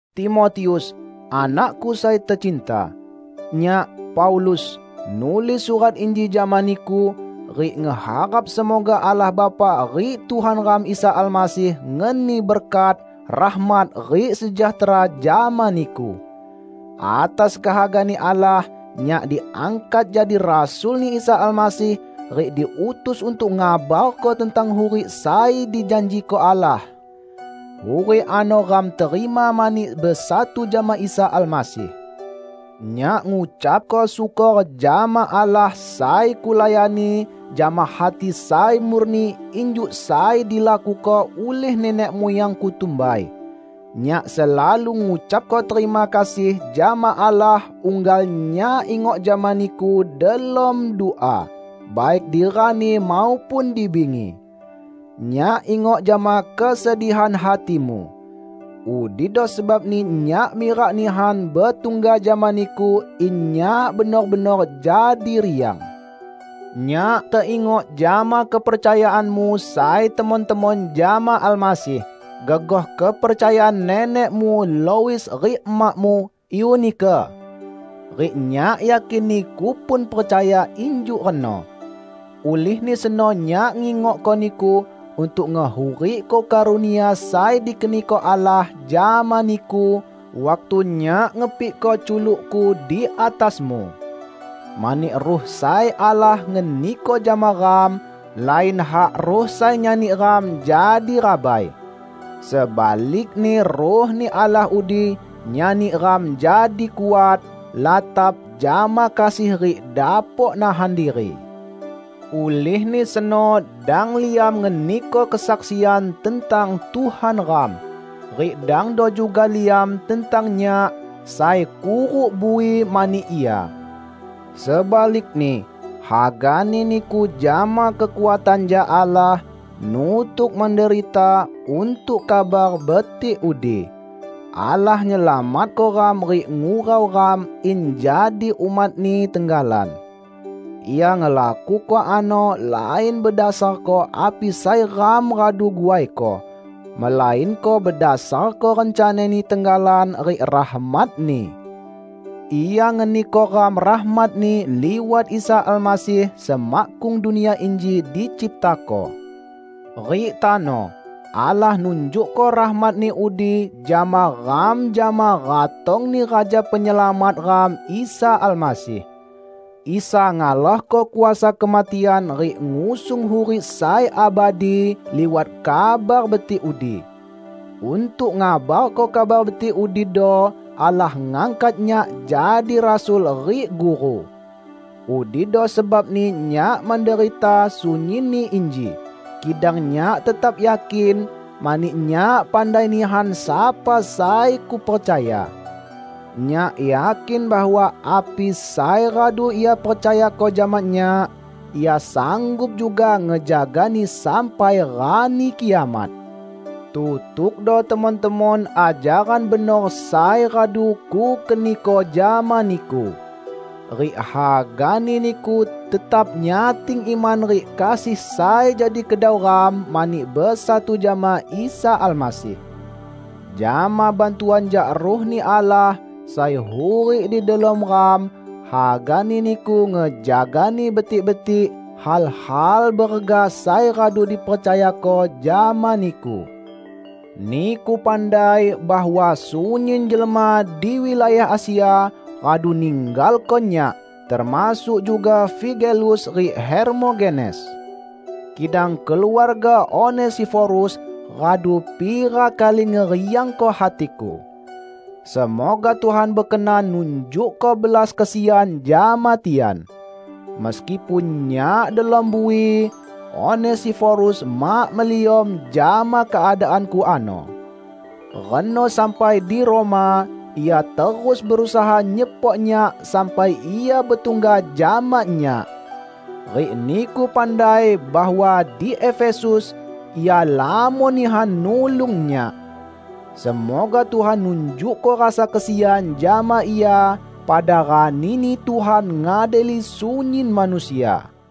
Timotius, anakku sai tecinta! Nyak, Paulus, nulis surat inji jama niku, rik ngeharap semoga Allah Bapa rik Tuhan ram Isa Almasih ngeni berkat, rahmat rik sejahtera jama niku. Atas kehaga-Ni Allah, nyak diangkat jadi rasul-Ni Isa Almasih rik diutus untuk ngabarko tentang hurik sai dijanjiko Allah. Hurik ano ram terima mani besatu jama Isa Almasih. Nyak ngucapko syukor jama Allah sai kulayani jama hati sai murni injuk sai dilakuko ulih nenek muyangku tumbai. Nyak selalu ngucapko terima kasih jama Allah unggal nyak ingok jama niku delom dua, baik di rani maupun di bingi. Nyak ingok jama kesedihan hatimu. Udido sebabni nyak mirak nihan betungga jama niku in nyak benor-benor jadi riang. Nyak teingok jama kepercayaanmu sai temon-temon jama Almasih, gegoh kepercayaan nenekmu Lois rik emakmu Eunike. Rik nyak yakin niku pun percaya injuk reno. Ulihni seno nyak ngingokko niku untuk ngehurikko karunia sai dikeniko Allah jama niku waktu nyak ngepikko culukku di atasmu. Mani Ruh sai Allah ngeniko jama ram, lain hak Ruh sai nyani ram jadi rabai. Sebalikni Ruh-Ni Allah udi nyani ram jadi kuat, latap jama kasih rik dapok nahan diri. Ulihni seno dang liam ngeniko kesaksian tentang Tuhan ram, rik dangdo juga liam tentang nyak, sai kuruk bui mani Ia. Sebalikni, hagani niku jama kekuatan jak Allah, nutuk menderita untuk Kabar Betik udi. Allah nyelamatko ram rik ngurau ram in jadi umat-Ni tenggalan. Ia ngelakuko ano lain bedasarko api sai ram radu guaiko, melainko bedasarko rencana-Ni tenggalan rik rahmat-Ni. Ia ngeniko ram rahmat-Ni liwat Isa Almasih semakkung dunia inji diciptako. Rik tano, Allah nunjukko rahmat-Ni udi jama ram jama ratong-Ni Raja Penyelamat ram Isa Almasih. Isa ngalahko kuasa kematian rik ngusung hurik sai abadi liwat Kabar Betik udi. Untuk ngabarko Kabar Betik udido Allah ngangkat nyak jadi rasul rik guru. Udido sebabni nyak menderita sunyinni inji, kidang nyak tetap yakin, mani nyak pandai nihan sapa sai kupercaya. Nyak yakin bahwa api sai radu Ia percayako jama nyak, Ia sanggup juga ngejagani sampai Rani Kiamat. Tutukdo temon-temon ajaran benor sai radu kukeniko jama niku. Rik hagani niku tetap nyating iman rik kasih sai jadi kedau ram mani besatu jama Isa Almasih. Jama bantuan jak Ruh-Ni Allah sai hurik di delom ram, hagani niku ngejagani betik-betik hal-hal berega sai radu dipercayako jama niku. Niku pandai bahwa sunyin jelma di wilayah Asia radu ninggalko nyak, termasuk juga Figelus rik Hermogenes. Kidang keluarga Onesiforus radu pira kali ngeriangko hatiku. Semoga Tuhan bekenan nunjukko belas kesian jama tian. Meskipun nyak delom bui, Onesiforus mak meliom jama keadaanku ano. Reno sampai di Roma, ia terus berusaha nyepok nyak sampai ia betungga jama nyak. Rik niku pandai bahwa di Efesus ia lamon nihan nulung nyak. Semoga Tuhan nunjukko rasa kesian jama ia pada rani-Ni Tuhan ngadili sunyin manusia.